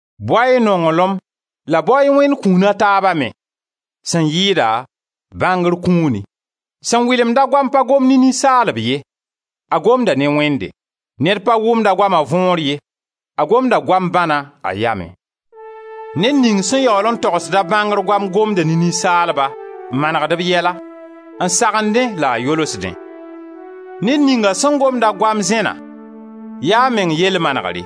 Bao-y nonglem la bao-y Wẽnd kũun a taaba me, sẽn yɩɩda bãngr kũuni. Sẽn wɩlemda goam pa gomd ne ninsaalb ye, a gomda ne Wẽnde. Ned pa wʋmd a goama võor ye, a gomda goam bãna a yamẽ. Ned ning sẽn yaool n togsda bãngr goam, gomda ne ninsaalba n manegd b yɛla, n sagendẽ la a yolsdẽ. Ned ninga sẽn gomda goam zẽna, ya a meng yell manegre;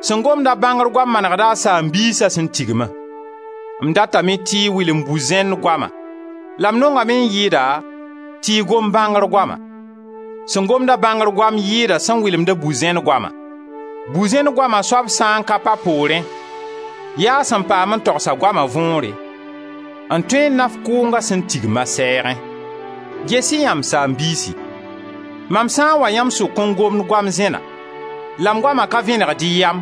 sẽn gomda bãngr goam manegda a saam-biisa sẽn tigma. M datame tɩ y wɩlem bu-zẽn goama la m nongame n yɩɩda tɩ y gom bãngr goama; sẽn gomda bãngr goam yɩɩda sẽn wɩlemda bu-zẽn goama. Bu-zẽn goama soab sã n ka pa poorẽ, yaa a sã n paam n togsa a goama võore, n tõe n naf kʋʋnga sẽn tigm a sɛɛgẽ. Ges-y yã, m saam-biisi, mam sã n wa yãmb sʋk n gomd goam zẽna la m goama ka vẽnegd y yam,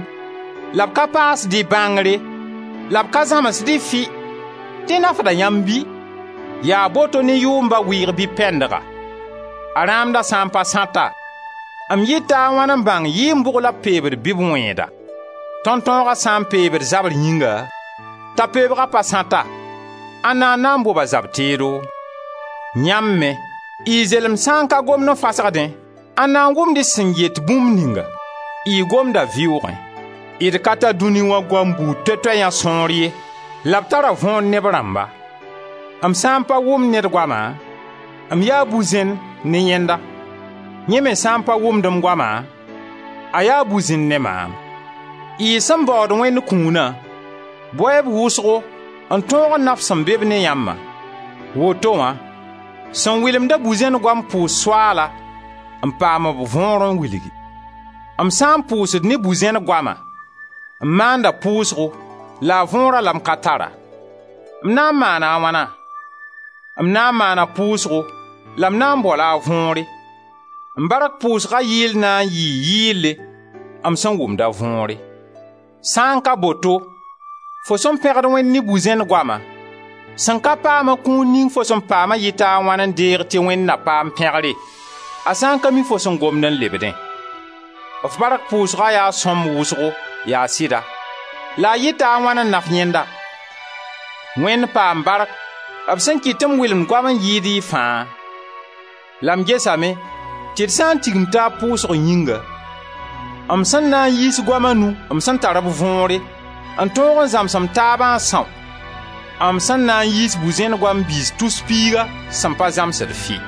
la b ka paasd y bãngre, la b ka zãmsd-y fɩ, dẽ nafda yãmb bɩ? Yaa boto ne yʋʋmba wɩɩg bɩ pɛndga: b rãamda sã n pa sãta, m yɩta a wãn n bãng yɩɩn bʋg la b pebd bɩ b wẽeda? Tõntõoga sã n peebd zabr yĩnga, t'a peebga pa sãta, ãnda n na n bob a zab-teedo? Yãmb me, y zelemd sã n ka gomd n fasgdẽ, ãnda n wʋmd y sẽn yet bũmb ninga? Y gomda vɩʋʋgẽ. D ka tar dũni wã goam buud toɛ-toɛ yã sõor ye la b tara võor ne b rãmba. M sã n pa wʋmd ned goama, m yaa bu-zẽnd ne yẽnda; yẽ me sã n pa wʋmd m goama, a yaa bu-zẽnd ne maam. Y sẽn baood Wẽnd kũuna, bao-y-b wʋsgo n tõog n naf sẽn be-b ne yãmbã. Woto wã sẽn wɩlemda bu-zẽn goam pʋʋs Soaala n paam b võor n wilgi. M sã n pʋʋsd ne bu-zẽn goama, m maanda pʋʋsgo la a võora la m ka tara. M na n maana wãna? M na n maana pʋʋsgo la m na n bao-la a võore. M bark pʋʋsga yɩɩl na n yɩɩ yɩɩlle m sẽn wʋmd a võore. Sã n ka boto, fo sẽn pẽgd Wẽnd ne bu-zẽn goama, sẽn ka paam-a kũun ning fo sẽn paama yɩta a wãn n deeg tɩ Wẽnd na paam pẽgre, a sã n ka mi fo sẽn gomd n lebdẽ. F bark pʋʋsga yaa sõmb wʋsgo, yaa sɩda, la a yɩta a wãn naf yẽnda? Wẽnd paam bark b sẽn kɩt tɩ m wɩlemd goam n yɩɩd y fãa! La m gesame tɩ d sã n tigim taab pʋʋsg yĩnga, m sẽn na n yiis goam a nu m sẽn tar b võore, n tõog n zãms m taaba n são m sẽn na n yiis bu-zẽn goam biis tus piiga sẽn pa zãmsd fɩ.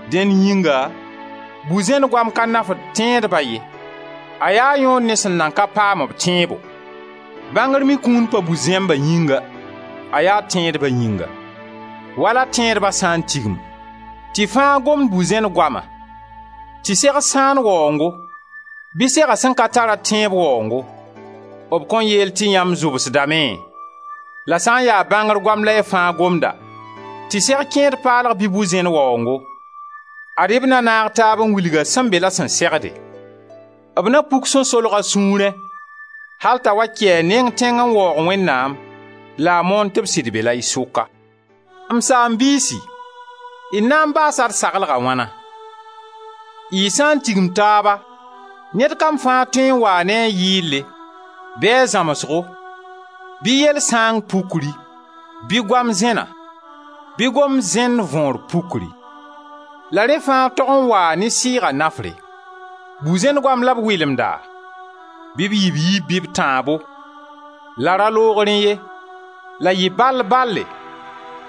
Dẽn yĩnga bu-zẽn goama ka nafd tẽedba ye, a yaa yõod ne sẽn nan ka paam-b tẽebo; bãngr me kũun pa bu-zẽmba yĩnga, a yaa tẽedba yĩnga wala Tẽedba sã n tigim, tɩ fãa gomd bu-zẽnd goama, tɩ seg sãan waoongo bɩ sega sẽn ka tar-a tẽeb waoongo, b kõn yeel tɩ yãmb zʋbsdame? La sã n ya bãngr goam la y fãa gomda tɩ seg kẽed paalga bɩ bu-zẽn waoongo, ad-y b na naag taab n wilg-a sẽn be la sẽn segde; b na puk sẽn solg a sũurẽ al t'a wa kɩ a neng tẽng n waoog Wẽnnaam la a moon tɩ b sɩd be-la y sʋka. M saam-biisi, d na n baasa d saglga wãna? Y sã n tigim taaba ned kam fãa tõe n waa ne a yɩɩle, bɩ a zãmsgo, bɩ yell sãang pukri, bɩ goam zẽna, bɩ gomd zẽnd võor pukri. La rẽ fãa tog n waa ne sɩɩga nafre. Bu-zẽn goam la b wɩlemda? Bɩ b yɩ b yiib bɩ b tãabo, la ra loog rẽ ye, la yɩ bal-bale,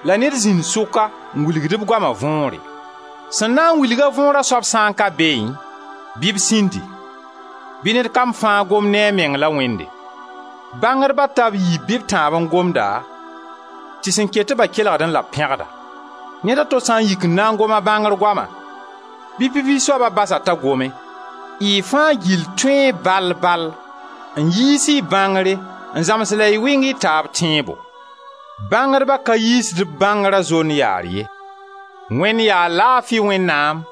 la ned zĩnd sʋka n wilgd b goama võore. Sẽn na n wilg võora soab sã n ka beẽ bɩ b sĩndi; bɩ ned kam fãa gom ne a meng la Wẽnde. Bãngdba ta b yiib bɩ b tãabo n gomda tɩ sẽn ket-ba kelgdẽ la b pẽgda. Ned a to sã n yik n na n gom a bãngr goama, bɩ pipi soaba bas-a t'a gome. Y fãa gill tõee, bal-bal, n yiis y bãngre n zãms la y wɩng y taab tẽebo. Bãngdba ka yiisd b bãngra zond-yaar ye; Wẽnd yaa laafi Wẽnnaam,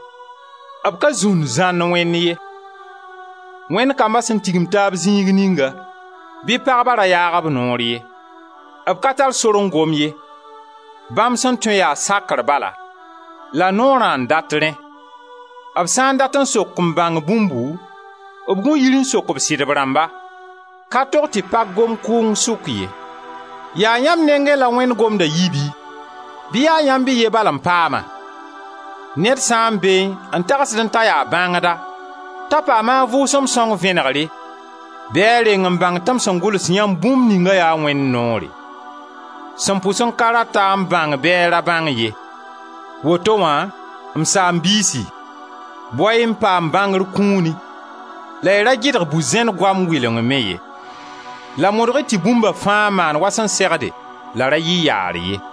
b ka zũnd-zãnd Wẽnd ye. Wẽnd kamba sẽn tigimd taab zĩig ninga, bɩ pagba ra yaag b noor ye. B ka tar sor n gom ye; bãmb sẽn tõe yaa sakr bala, la Noorã n dat rẽ. B sã n dat n sok n bãng bũmbu, b gũ yir n sok b sɩdb rãmba. Ka tog tɩ pag gom kʋʋng sʋk ye. Yaa yãmb nengẽ la Wẽnd gomda yi bɩ? Bɩ yaa yãmb y ye bal n paam-a? Ned sã n beẽ n tagsdẽ t'a yaa bãngda, t'a paama a Vʋʋsem sõng vẽnegre, bɩ a reng n bãng tɩ m sẽn gʋls yãmb bũmb ningã yaa Wẽnd noore. Sẽn pʋs n ka rat-a n bãng bɩ a ra bãng ye. Woto wã, m saam-biisi, bao-y n paam bãngr kũuni, la y ra gɩdg bu-zẽn goam wɩleng me ye. La modg-y tɩ bũmba fãa maan wa sẽn segde la ra yɩ yaar ye.